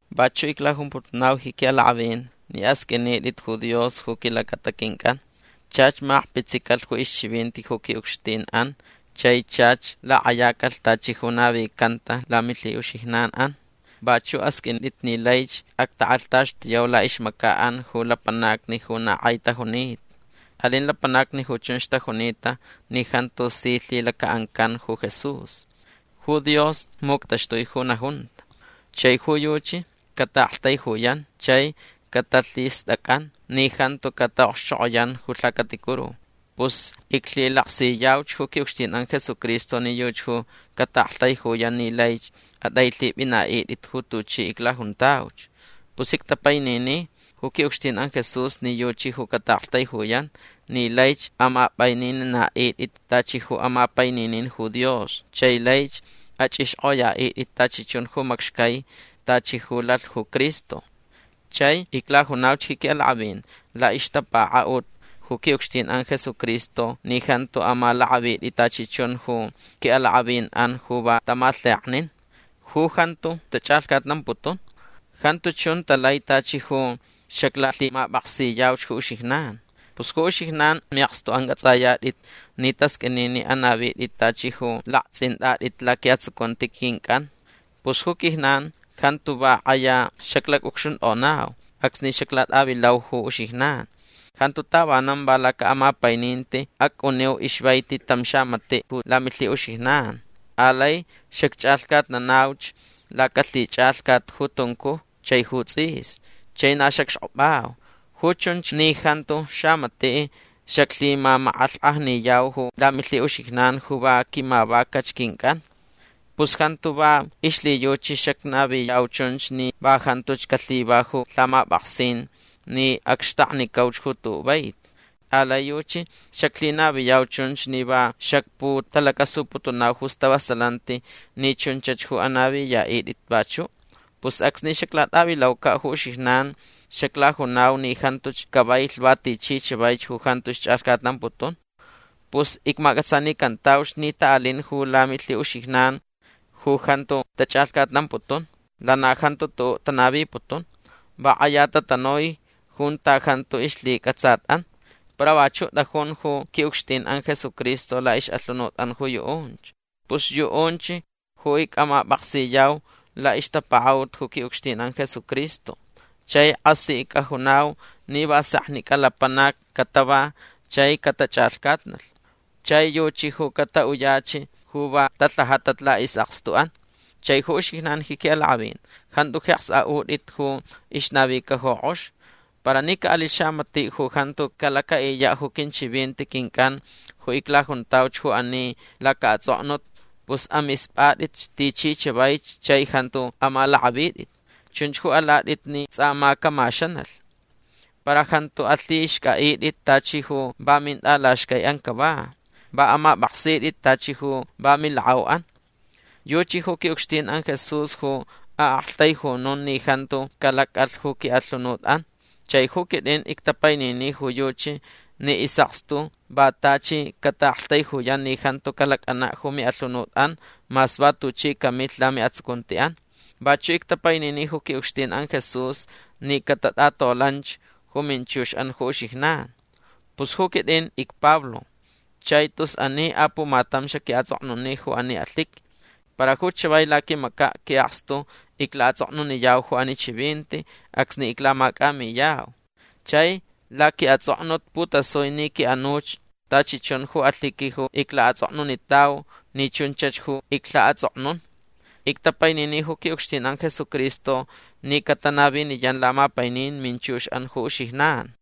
Vachuʼ iclajumputunau ji quiʼalakʼavin ni asqʼuinitʼit ju Dios ju quilacata quincʼan. Chach makpitsicalh ju ixchivinti ju quiʼucxtinʼan chai chach lakʼayacalh tachi ju navicanta lamilhiʼuxijnanʼan. Vachuʼ asqʼuintʼit ni laich actakʼalhtaxtuyau laʼixmacaʼan ju lapanacni ju na kʼai tajunita. Alin lapanacni ju chunch tajunita ni jantu si lhilacaʼancan ju Jesús. Ju Dios muctaxtui ju najunta. Chai ju yuchi cataʼaktaijuyan chai catalhistʼacʼan ni jantu cataʼokxchokʼoyan ju lhacaticuru. Pus iclhilaksiyauch ju quiʼucxtinʼan Jesucristo ni yuchi ju cataʼaktaijuyan ni laich atʼailhipʼinaʼitʼit ju tuchi iclajuntauch. Pus ictapainini ju quiʼucxtinʼan Jesús ni yuchi ju cataʼaktaijuyan ni laich amapʼainininaʼitʼit tachi ju amapaininin ju Dios chai laich achʼixkʼoyaʼitʼit tachi chun ju macxcai tachi ju lalh ju Cristo. Chai iclajunauch ji quiʼalakʼavin laʼixtapakaʼut ju quiʼucxtinʼan Jesucristo ni jantu amalakʼavitʼit tachi chun ju quiʼalakʼavinʼan ju va tamalheknin. Ju jantu tachʼalhcatnamputun. Jantu chun talai tachi ju xaclalhimapʼaksiyauch ju uxijnan. Pus ju uxijnan miʼakstuʼan cʼatsʼayatʼit ni tasqʼuini ni anavitʼit tachi ju laktsʼintʼatʼit laquiʼatsucunti quincʼan. Pus ju quijnan jantu va kʼaya xaclacʼucxuntʼonau acsni xaclatʼavilau ju uxijnan. Jantu tavanan va lacaʼamapaininti acʼuniu ixvaiti tam xamatiʼ ju lamilhiʼuxijnan. Alai xacchʼalhcatnanauch lacalhichʼalhcat ju tuncuj chai ju tsʼis. Chai na xacxkʼopʼau. Ju chunch ni jantu xamatiʼ xaclhimamakʼalhkʼajniyau ju lamilhiʼuxijnan ju va quimavacach quincʼan. Pus jantu va ixlhiyuchi xacnaviyau chunch ni va jantuch calhiva ju lhamapʼaksin ni acxtaknicauch ju tuʼuʼ vaiti. Alai yuchi xaclhinaviyau chun ni va xacputalacasuputunau ju stavasalanti ni chunchach ju anaviyaʼitʼit vachuʼ. Pus acsni xaclatʼavilaucaʼ ju uxijnan xaclajunau ni jantuch cavailh va tichi chavaich ju jantuch chʼalhcatnamputun. Pus icmacʼatsanicantauch ni taʼalin ju lamilhiʼuxijnan ju jantu tachʼalhcatnamputun. Lana jantu tuʼuʼ tanaviputun. Va kʼaya tatanui junta jantu ixlhicʼatsatʼan. Para vachuʼ tʼajun ju quiʼucxtinʼan Jesucristo laʼixʼalhunutʼan ju yuʼunch. Pus yuʼunch ju icʼamapʼaksiyau laʼixtapakaʼut ju quiʼucxtinʼan Jesucristo. Chai kʼasi icʼajunau ni va seknicʼa lapanacni catava chai catachʼalhcatnalh. Chai yuchi ju cataʼuyach ju va talhajatach laʼisʼakstuʼan. Chai ju uxijnan ji quiʼalakʼavin jantu jeks aʼutʼit ju ixnavica ju kʼox. Para ni caʼalilh xamatiʼ ju jantu calacaʼiyaʼ ju quinchivinti quincʼan ju iclajuntauch ju ani lacaʼatsʼoknut pus amispʼatʼitch tichi chavaich chai jantu amalakʼavitʼit. Chunch ju alatʼit ni tsʼa ma camaxanalh. Para jantu alhixcʼaʼitʼit tachi ju va mintʼalaxcaiʼan cava. Va amapʼaksitʼit tachi ju va milakʼauʼan. Yuchi ju quiʼucxtinʼan Jesús ju aʼaktaijunun ni jantu calacʼalh ju quiʼalhunutʼan. Chai ju quitʼin ictapainini ju yuchi ni isʼakstu va tachi cataʼaktaijuyan ni jantu calacʼanaʼ ju miʼalhunutʼan mas va tuchi camilh lamiʼatsucuntiʼan. Vachuʼ ictapainini ju quiʼucxtinʼan Jesús ni catatʼatolanch ju minchuxʼan ju uxijnan. Pus ju quitʼin icPablo. Chai tus ani apumatam xaquiʼatsʼoknuni ju ani alhiqui. Para ju chavai laquimacaʼ quiʼakstu iclaʼatsʼoknuniyau ju ani chivinti acsni iclamacʼamiyau. Chai laquiʼatsʼoknut putasui ni quiʼanuch tachi chun ju alhiqui ju iclaʼatsʼoknunitau ni chunchach ju iclhaʼatsʼoknun. Ictapainini ju quiʼucxtinʼan Jesucristo ni catanaviniyan lamapainin minchuxʼan ju uxijnan.